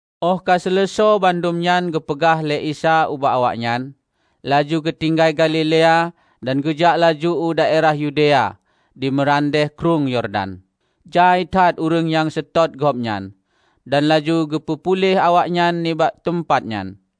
Óh ka seuleusoe bandum nyan geupeugah lé Isa ubak awaknyan, laju geutinggai Galilea dan geujak laju u daerah Yudea di meurandeh Krueng Yordan. Jai that ureuëng nyang seutôt Gobnyan, dan laju geupeu puléh awaknyan nibak teumpat nyan.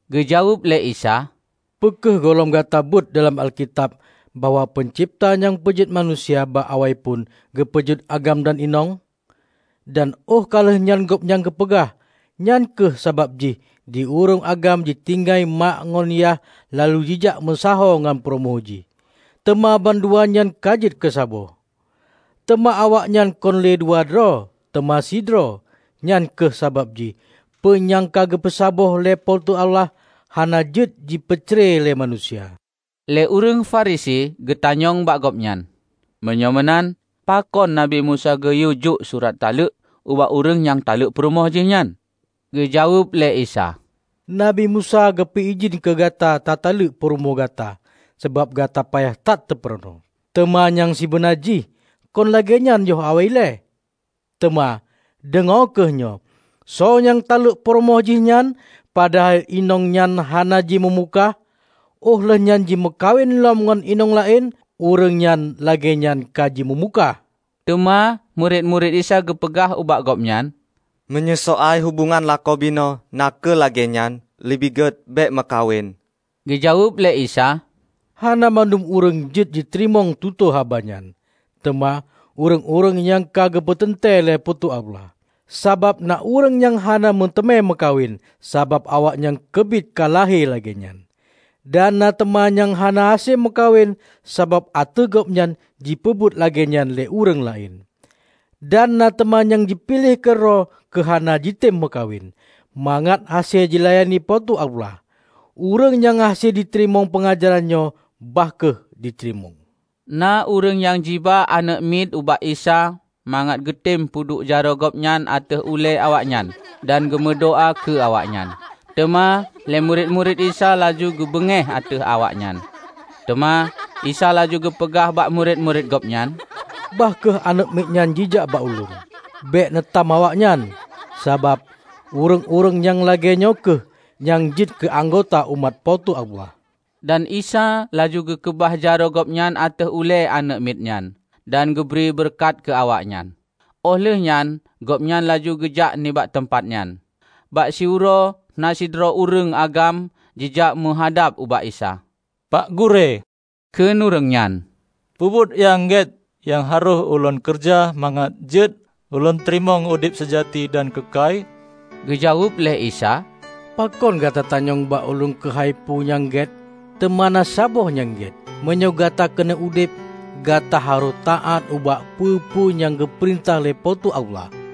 Geujaweueb lé Isa, "Peu kheueh gohlom gata beuet dalam Alkitab bahwa Peuncebta nyang peujeuet manusia, bak awaiphon geupeujeuet agam dan inong? Dan óh ka lheueh nyan Gobnyan geupeugah, 'Nyan kheueh sabab jih di ureuëng agam jitinggai mak ngon yah laju jijak meusaho ngon peurumoh jih, teuma bandua nyan ka jeuet keusaboh.' Teuma awaknyan kon lé dua droe, teuma sidroe. Nyan kheueh sabab jih peue nyang ka geupeu saboh lé Po teu Allah hana jeuet jipeu cre lé manusia." Lé ureuëng Farisi geutanyong bak Gobnyan, "Meunyoe meunan pakon Nabi Musa geuyue jok surat taleuek ubak ureuëng nyang taleuek purumoh jihnyan?" Geujaweueb lé Isa, "Nabi Musa geupeu idhin keu gata tataleuek purumoh gata sabab gata payah that teupeurunoe. Teuma nyang sibeuna jih kon lagée nyan yoh awai ilée. Teuma, deungoe kheueh nyoe: Soe nyang taleuek purumoh jihnyan -- padahai inong nyan hana jimeumukah -- óh lheueh nyan jimeukawen lom ngon inong laén, ureuëng nyang lagée nyan ka jimeumukah." Teuma murit-murit Isa geupeugah ubak Gobnyan, "Meunyoe soai hubongan lakoe binoe na kheueh lagée nyan, leubeh gét bék meukawen." Geujaweueb lé Isa, "Hana bandum ureuëng jeuet jiteurimong tutoe haba nyan, teuma ureuëng-ureuëng nyang ka geupeuteuntée lé Po teu Allah. Sabab na ureuëng nyang hana meuteumé meukawen, sabab awaknyan keubiet ka lahé lagée nyan. Dan na teuma nyang hana hase meukawen sabab ateueh gobnyan jipeubuet lagée nyan lé ureuëng laén. Dan na teuma nyang jipiléh keudroe keu hana jitem meukawen, mangat hase jilayani Po teu Allah. Ureuëng nyang hase jiteurimong peungajaran nyoe, bah kheueh jiteurimong." Na ureuëng nyang jiba aneuëk miet ubak Isa mangat geutem peuduek jaroe Gobnyan ateueh ulée awaknyan dan geumeudoá keu awaknyan. Teuma lé murit-murit Isa laju geubeungéh ateueh awaknyan. Teuma Isa laju geupeugah bak murit-murit Gobnyan, "Bah kheueh aneuëk miet nyan jijak bak Ulôn! Bék neu tham awaknyan, sabab ureuëng-ureuëng nyang lagée nyoe kheueh nyang jeuet keu anggota umat Po teu Allah." Dan Isa laju geukeubah jaroe Gobnyan ateueh ulée aneuëk miet nyan dan geubri beureukat keu awaknyan. Óh lheueh nyan Gobnyan laju geujak nibak teumpat nyan. Bak siuroe na sidroe ureuëng agam jijak meuhadab ubak Isa, "Pak Gurée," kheun ureuëng nyan, "peubuet nyang gét nyang harôh ulôn keureuja mangat jeuet ulôn teurimong udeb seujati dan keukai?" Geujaweueb lé Isa, "Pakon gata tanyong bak Ulôn keuhai peue nyang gét? Teuma na saboh nyang gét. Meunyoe gata keuneuk udeb, gata harôh taát ubak peue-peue nyang geupeurintah lé Po teu Allah."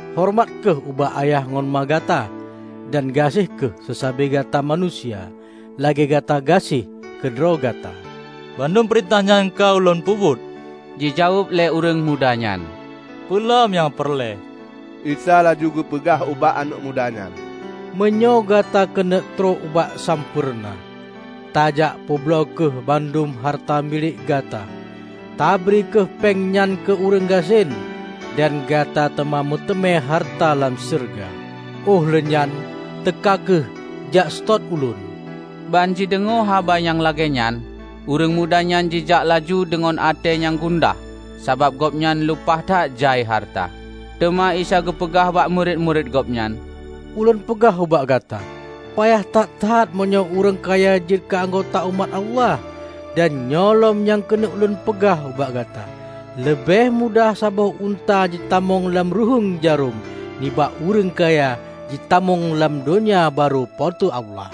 horeumat kheueh ubak ayah ngon ma gata; dan gaséh kheueh seusabe gata manusia lagée gata gaséh keu droe gata." "Bandum peurintah nyan ka ulôn peubuet," jijaweueb lé ureuëng muda nyan. "Peue lom nyang peureulée?" Isa laju geupeugah ubak aneuëk muda nyan, "Meunyoe gata keuneuk trok bak sampoereuna, tajak peubloe kheueh bandum hareuta milék gata. Tabri kheueh péng nyan keu ureuëng gasien, dan gata teuma meuteumé hareuta lam syeuruga. Óh lheueh nyan, teuka kheueh jak seutôt Ulôn!" Ban jideungoe haba nyang lagée nyan, ureuëng muda nyan jijak laju deungon até nyang gundah sabab gobnyan lumpah that jai hareuta. Teuma Isa geupeugah bak murit-murit Gobnyan, "Ulôn peugah ubak gata, payah that-that meunyoe ureuëng kaya jeuet keu anggota umat Allah. Dan nyoe lom nyang keuneuk Ulôn peugah ubak gata; leubeh mudah saboh unta jitamong lam ruhuéng jarôm, nibak ureuëng kaya jitamong lam Donya Barô Po teu Allah."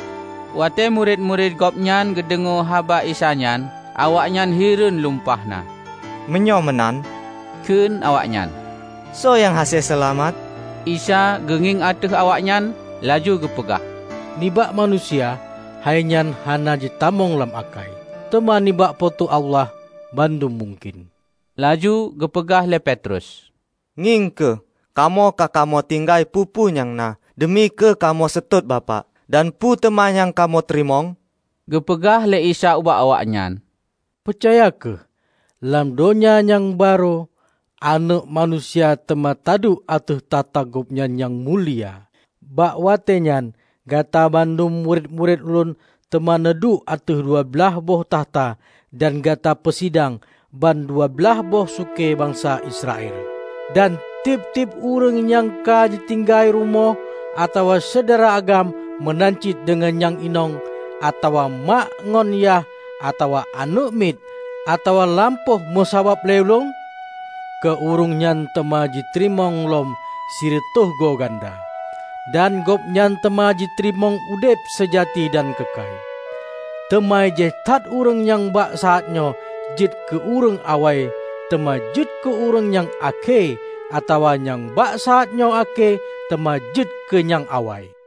Watée murit-murit Gobnyan geudeungoe haba Isa nyan, awaknyan hireuen lumpah na. "Meunyoe meunan," kheun awaknyan, "soe nyang hase seulamat?" Isa geungieng ateueh awaknyan laju geupeugah, "Nibak manusia, hai nyan hana jitamong lam akai! Teuma nibak Po teu Allah, bandum mungken." Laju geupeugah lé Petrus, "Ngieng kheueh, kamoe ka kamoe tinggai peue-peue nyang na deumi keu kamoe seutôt Bapak. Dan peu teuma nyang kamoe teurimong?" Geupeugah lé Isa ubak awaknyan, "Peucaya kheueh: Lam Donya nyang Barô, Aneuëk Manusia teuma taduek ateueh takhta Gobnyan nyang mulia. Bak watée nyan gata bandum murit-murit Ulôn teuma neuduek ateueh dua blaih boh takhta dan gata peusidang ban dua blaih boh sukée bansa Israel! Dan tieb-tieb ureuëng nyang ka jitinggai rumoh, atawa syedara agam meunan cit deungon nyang inong, atawa mak ngon yah, atawa aneuëk miet, atawa lampôh meusabab lé Ulôn, keu ureuëng nyan teuma jiteurimong lom sireutôh go ganda. Dan gobnyan teuma jiteurimong udeb seujati dan keukai. Teuma jai that ureuëng nyang bak saát nyoe jeuet keu ureuëng awai teuma jeuet keu ureuëng nyang akhé atawa nyang bak saátnyoe akhé teuma jeuet keu nyang awai."